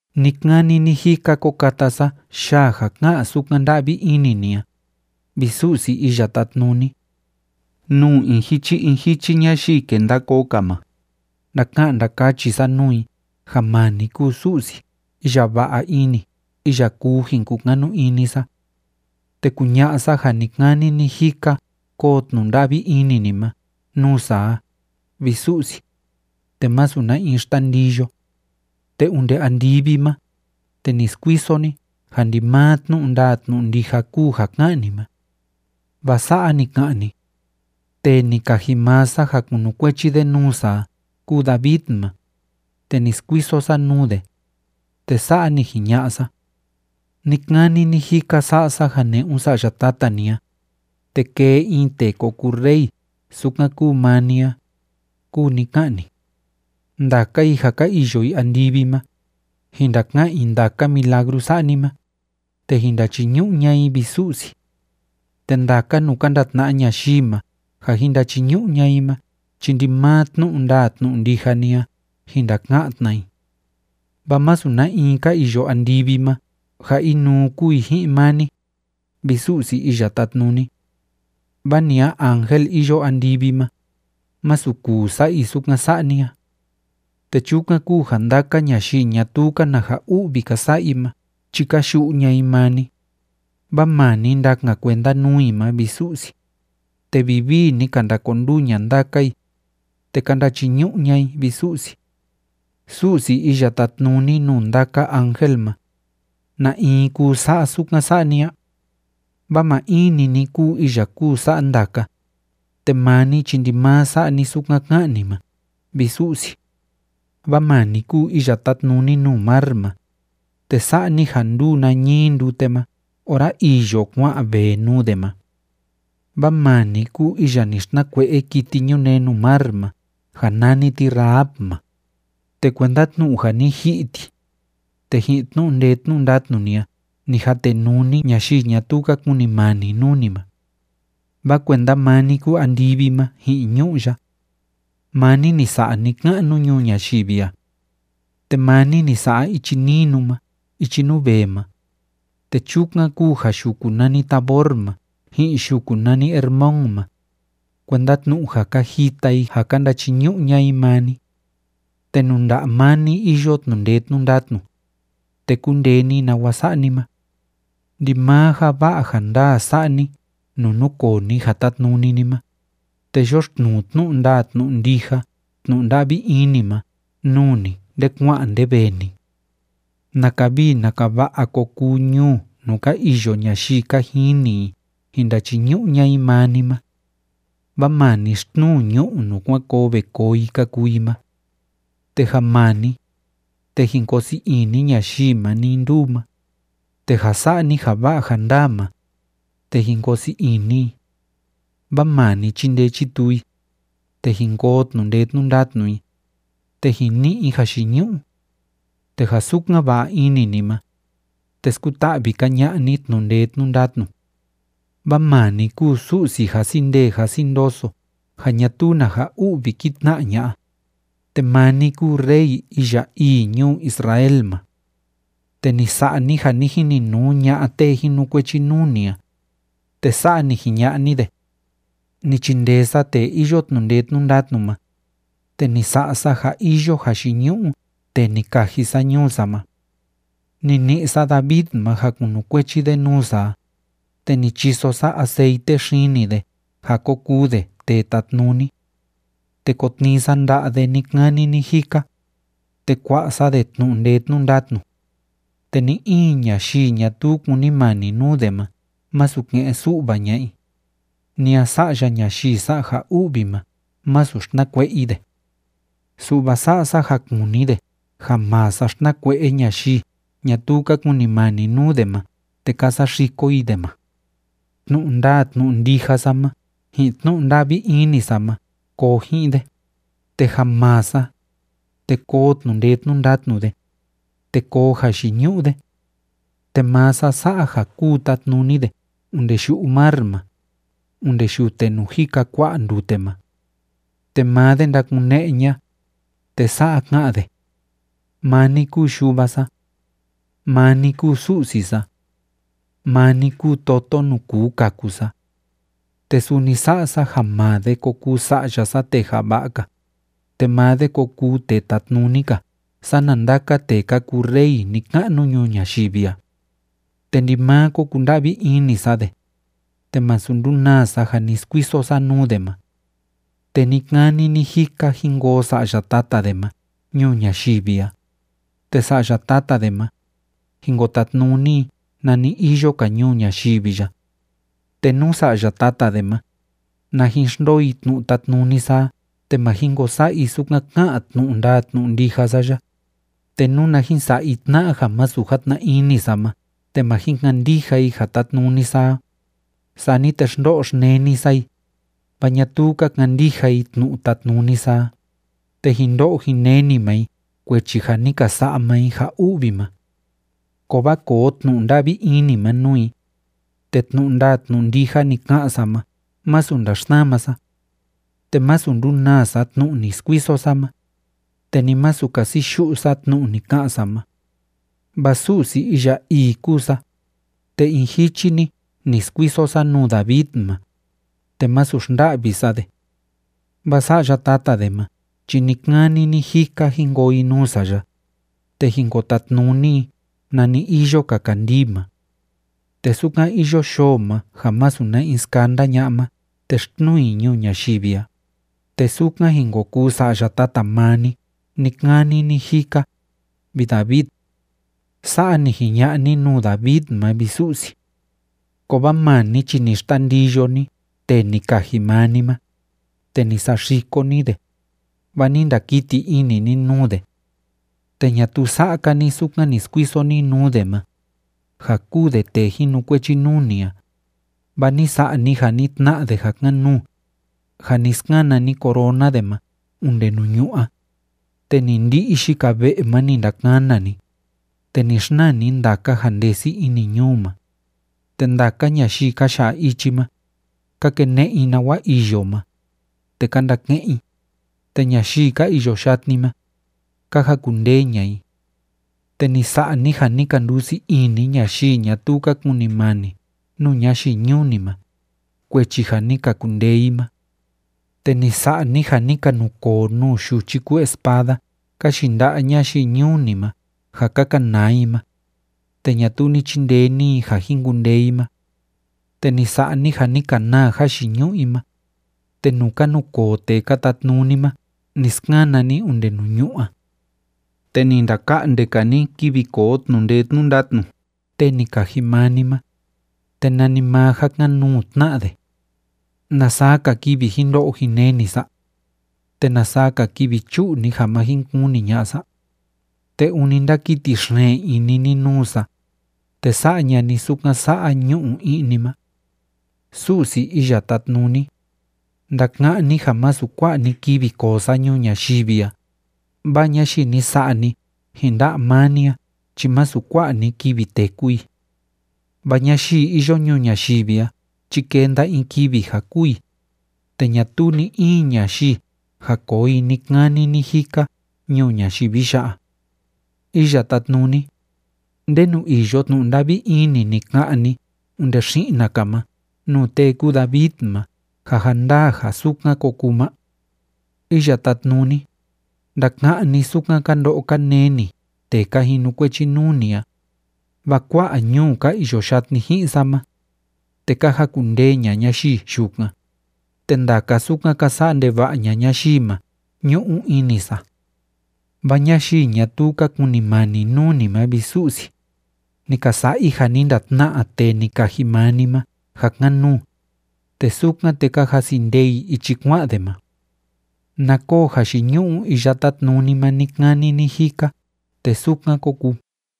Ni‑kani ni‑jika ko kata sa yaa ja ká'an sukan nda'vi ini ni a, vi Su'si Iya Tátnuni. Nuu in jichi in jichi ñayii kenda koo‑ka ma, ndaka'an ndakachi sa nuu i ja maa ni kúu Su'si iya va'a ini iya kuu jin kukanu ini sa. Te kuña'a sa ja ni‑kani ni‑jika koo tnu'u nda'vi ini ni ma nuu sa a, vi Su'si, te másu na in xtandiyo. Te onde andivi ma, te ni skuiso ni ja ndimaa tnu'u ndaa tnu'u ndija kúu ja ká'an ni ma. Vaa sa'a ni ka'an ni: “Tee ni kaji maa sa ja kunukuechi de nuu sa a kúu David ma, te ni skuiso sa nuu de, te sa'a ni jiña'a sa: Ni‑kani ni‑jika sa'a sa ja ne'un sa'ya tata ni a, te kee in tee ko kuu rey sukan kúu maa ni a”, kúu ni ká'an ni. Ndaka i ja ka iyo i andivi ma, jin ndaka'an i ndaka milagru sa'a ni ma, te jin ndachiñu'u ña'a i, vi Su'si. Te ndaka nuu ka ndatna'a ñayii ma ja jin ndachiñu'u ña'a i ma chi ndimaa tnu'u ndaa tnu'u ndija ni a jin ndaka'an tna i. Vaa másu na in ka iyo andivi ma ja inuu kúu i ji'in maa ni, vi Su'si Iya Tátnuni. Vaa ni a in ángel iyo andivi ma, másu kuu sa'a i sukan sa'a ni a. Te chukan kúu ja ndaka ñayii ñatuu‑ka na ja u'vi ka sa'a i ma chi ka yu'u ña'a i maa ni, vaa maa ni ndakan kuenda nuu i ma, vi Su'si, te vivii ni ka ndakonduu ña'a ndaka i, te ka ndachiñu'u ña'a i, vi Su'si. Su'si iya tátnuni nuu ndaka ángel ma, ¿na in kuu sa'a sukan sa'a ni a? Vaa maa in‑ni ni kúu iya kúu sa'a ndaka, te maa ni chi ndimaa sa'a ni sukan ká'an ni ma, vi Su'si. Vaa maa ni kúu iya tátnuni nuu mar ma, te sa'a ni ja ndúu nañii ndute ma ora îyo kua'an vee nuu de ma. Vaa maa ni kúu iya ni xtnakue'e kiti ñunee nuu mar ma ja nani ti Rahab ma, te kuenda tnu'u ja ni ji'i ti, te ji'in tnu'u ndee tnu'u ndatnu ni a ni jatenuu ni ñayii ñatuu ka kunimani nuu ni ma. Vaa kuenda maa ni kúu andivi ma ji'in ñu'ú ya. Maa ni ni sa'a ni‑ka'nu ñuu ñayivi a. Te maa ni ni sa'a ichi ninu ma ichi nuu vee ma, te chukan kúu ja yuku nani Tabor ma ji'in yuku nani Hermón ma, kuenda tnu'u ja ka jita i ja ka ndachiñu'u ña'a i maa ni. Te nuu nda'a maa ni iyo tnu'u ndee tnu'u ndatnu, te kúndee ni nawa sa'a ni ma. Ndimaa ja va'a ja ndaa sa'a ni nuu núkoo ni ja tátnuni ni ma, te yoxtnuu tnu'u ndaa tnu'u ndija tnu'u nda'vi ini ma nuu ni nde kua'an nde vee ni. ¡Naka vii naka va'a ko kuu ñuu nuu ka iyo ñayii ka jini i jin ndachiñu'u ña'a i maa ni ma! Vaa maa ni xtnuu ñu'u nuu kuan koo ve koo i ka kuu i ma. Te ja maa ni, te jin koo sii ini ñayii ma nii nduu ma, te ja sa'a ni ja va'a ja ndaa ma, te jin koo sii ini i. Vaa maa ni chindee chituu i, te jin koo tnu'u ndee tnu'u ndatnu i, te jin ni'i i jayiñu'u. Te ja sukan va'a ini ni ma, te skuta'vi‑ka ña'a ni tnu'u ndee tnu'u ndatnu. Vaa maa ni kúu Su'si jasi ndee jasi ndoso ja ñatuu na ja u'vi kí tna'a ña'a, te maa ni kúu Rey iya ii ñuu Israel ma. Te ni sa'a ni ja ni jininuu ña'a tee jinukuechi nuu ni a, te sa'a ni jiña'a ni de: “Ni chindee sa tee iyo tnu'u ndee tnu'u ndatnu ma, te ni sa'a sa ja iyo jayiñu'u tee ni kaji sa ñuu sa ma. Ni ni'i sa David ma ja kunukuechi de nuu sa a, te ni chiso sa aceite xini de ja ko kuu de tee tatnuni. Te ko tnii sa nda'a de ni‑kani ni‑jika, te kua'a sa de tnu'u ndee tnu'u ndatnu. Te ni in ñayii ñatuu kúnimani nuu de ma másu ke'en su'va ña'a i, ni a sa'ya ñayii sa'a ja u'vi ma, masu xtnakue'e i de. Su'va sa'a sa ja kuni de ja maa sa xtnakue'e ñayii ñatuu ka kunimani nuu de ma te ka saxiko i de ma. Tnu'u ndaa tnu'u ndija sa ma ji'in tnu'u nda'vi ini sa ma koo ji'in de, te ja maa sa, te koo tnu'u ndee tnu'u ndatnu de, te koo jayiñu'u de. Te maa sa sa'a ja kúu tatnuni de onde yu'u mar ma, onde yute nuu jika kua'a ndute ma. Te maa de ndakune'e ña'a, te sa'a ka'an de: Maa ni kúu yuva sa. Maa ni kúu Su'si sa. Maa ni kúu toto nuu kuu kaku sa. Te suni sa'a sa ja maa de ko kuu sa'ya sa tee java'a‑ka, te maa de ko kuu tee tatnuni‑ka sana ndaka tee ka kuu rey ni‑ka'nu ñuu ñayivi a. Te ndimaa ko kunda'vi ini sa de, te masu ndunaa sa ja ni skuiso sa nuu de ma. Te ni‑kani ni‑jika jin koo sa'ya tata de ma ñuu ñayivi a, te sa'ya tata de ma, jin ko tatnuni i nani iyo‑ka ñuu ñayivi ya. Te nú sa'ya tata de ma, na jin xndoo i tnu'u tátnuni sa a te ma jin ko sa'a i sukan ká'an tnu'u ndaa tnu'u ndija sa ya, te nuna jin sa'a i tna'a ja masu játna ini sa ma te ma jin kandija i ja tátnuni sa a, sani te xndo'o xneni sa i, vaa ñatuu ka kandija i tnu'u tátnuni sa a, te jin ndo'o jin neni maa i kuechi ja ni ka sa'a maa i ja u'vi ma. Kovaa koo tnu'u nda'vi ini ma nuu i, te tnu'u ndaa tnu'u ndija ni ka'an sa ma másu ndaxsama sa. Te másu ndunaa sa tnu'u ni skuiso sa ma, te ni masu kasi yu'u sa tnu'u ni ka'an sa ma. Vaa Su'si iya ii kúu sa, te in jichi‑ni ni skuiso sa nuu David ma, te masu xnda'vi sa de. Vaa sa'ya tata de ma chi ni‑kani ni‑jika jin koo i nuu sa ya, te jin ko tatnuni i nani iyo‑ka kandii ma. Te sukan iyo yoo ma ja masu na in skanda ña'a ma te xtnuu i ñuu ñayivi a, te sukan jin ko kuu sa'ya tata maa ni ni‑kani ni‑jika, vi David.” Sa'a ni jiña'a ni nuu David ma, vi Su'si. Kovaa maa ni chi ni xtandiyo ni tee ni kaji maa ni ma, te ni saxiko ni de, vaa ni ndakiti ini ni nuu de. Te ñatuu sa'a‑ka ni sukan ni skuiso ni nuu de ma, ja kúu de tee jinukuechi nuu ni a, vaa ni sa'a ni ja ni tna'a de ja kan‑nuu, ja ni skana ni corona de ma onde nuu ñu'ú a. Te ni ndi'i yika ve'e ma ni ndakana ni, te ni xnaa ni ndaka ja ndesi ini ñuu ma. Te ndaka ñayii ka ya'a ichi ma, ka kene'e i nawa iyo ma, te ka ndake'en i, te ñayii ka iyo yatni ma, ka jakundee ña'a i. Te ni sa'a ni ja ni ka ndusii ini ñayii ñatuu ka kunimani nuu ñayii ñuu ni ma, kuechi ja ni ka kundee i ma. Te ni sa'a ni ja ni ka nukoo nuu yuchi kúu espada ka yinda'a ñayii ñuu ni ma ja ka kanaa i ma, te ñatuu ni chindee ni i ja jin kundee i ma. Te ni sa'a ni ja ni ka naa jayiñu'u i ma, te nuu ka nukoo tee ka tatnuni ma ni skana ni onde nuu ñu'ú a. Te ni ndaka'nde‑ka ni kivi koo tnu'u ndee tnu'u ndatnu tee ni kaji maa ni ma, te nanimaa ja kan‑nuu tna'a de. ¿Na saa‑ka kivi jin ndo'o jin neni sa? ¿Te na saa‑ka kivi chu'u ni ja ma jin kuni ña'a sa? ¿Te ûni ndákiti xeen ini ni nuu sa, te sa'a ña'a ni sukan sa'a ñu'u i'ni ma? Su'si Iya Tátnuni, ndaka'án ni ja masu kua'a‑ni kivi koo sa ñuu ñayivi a, vaa ñayii ni sa'a ni ji'in nda'a maa ni a chi masu kua'a‑ni kivi téku i. Vaa ñayii iyo ñuu ñayivi a chi kenda in kivi ja kûu i, te ñatuu ni‑in ñayivi ja koo i ni‑kani ni‑jika ñuu ñayivi ya'a. Iya Tátnuni, ¿ndenu iyo tnu'u nda'vi ini ni ka'an ni onde xi'na‑ka ma nuu tee kúu David ma ja ja ndaa ja sukan ko kuu ma? Iya Tátnuni, ndaka'án ni sukan ka ndo'o ka neni tee ka jinukuechi nuu ni a, vaa kua'a ñuu ka iyo yatni ji'in sa ma, te ka jakundee ña'a ñayii yukan, te ndaka sukan ka sa'a ndeva'a ña'a ñayii ma ñu'u ini sa. Vaa ñayii ñatuu ka kunimani nuu ni ma, vi Su'si, ni ka sa'a i ja ni ndatna'a tee ni kaji maa ni ma ja kan‑nuu, te sukan, te ka jasi ndee i ichi kua'an de ma. Na koo jayiñu'u Iya Tátnuni ma ni‑kani ni‑jika, te sukan kó kuu.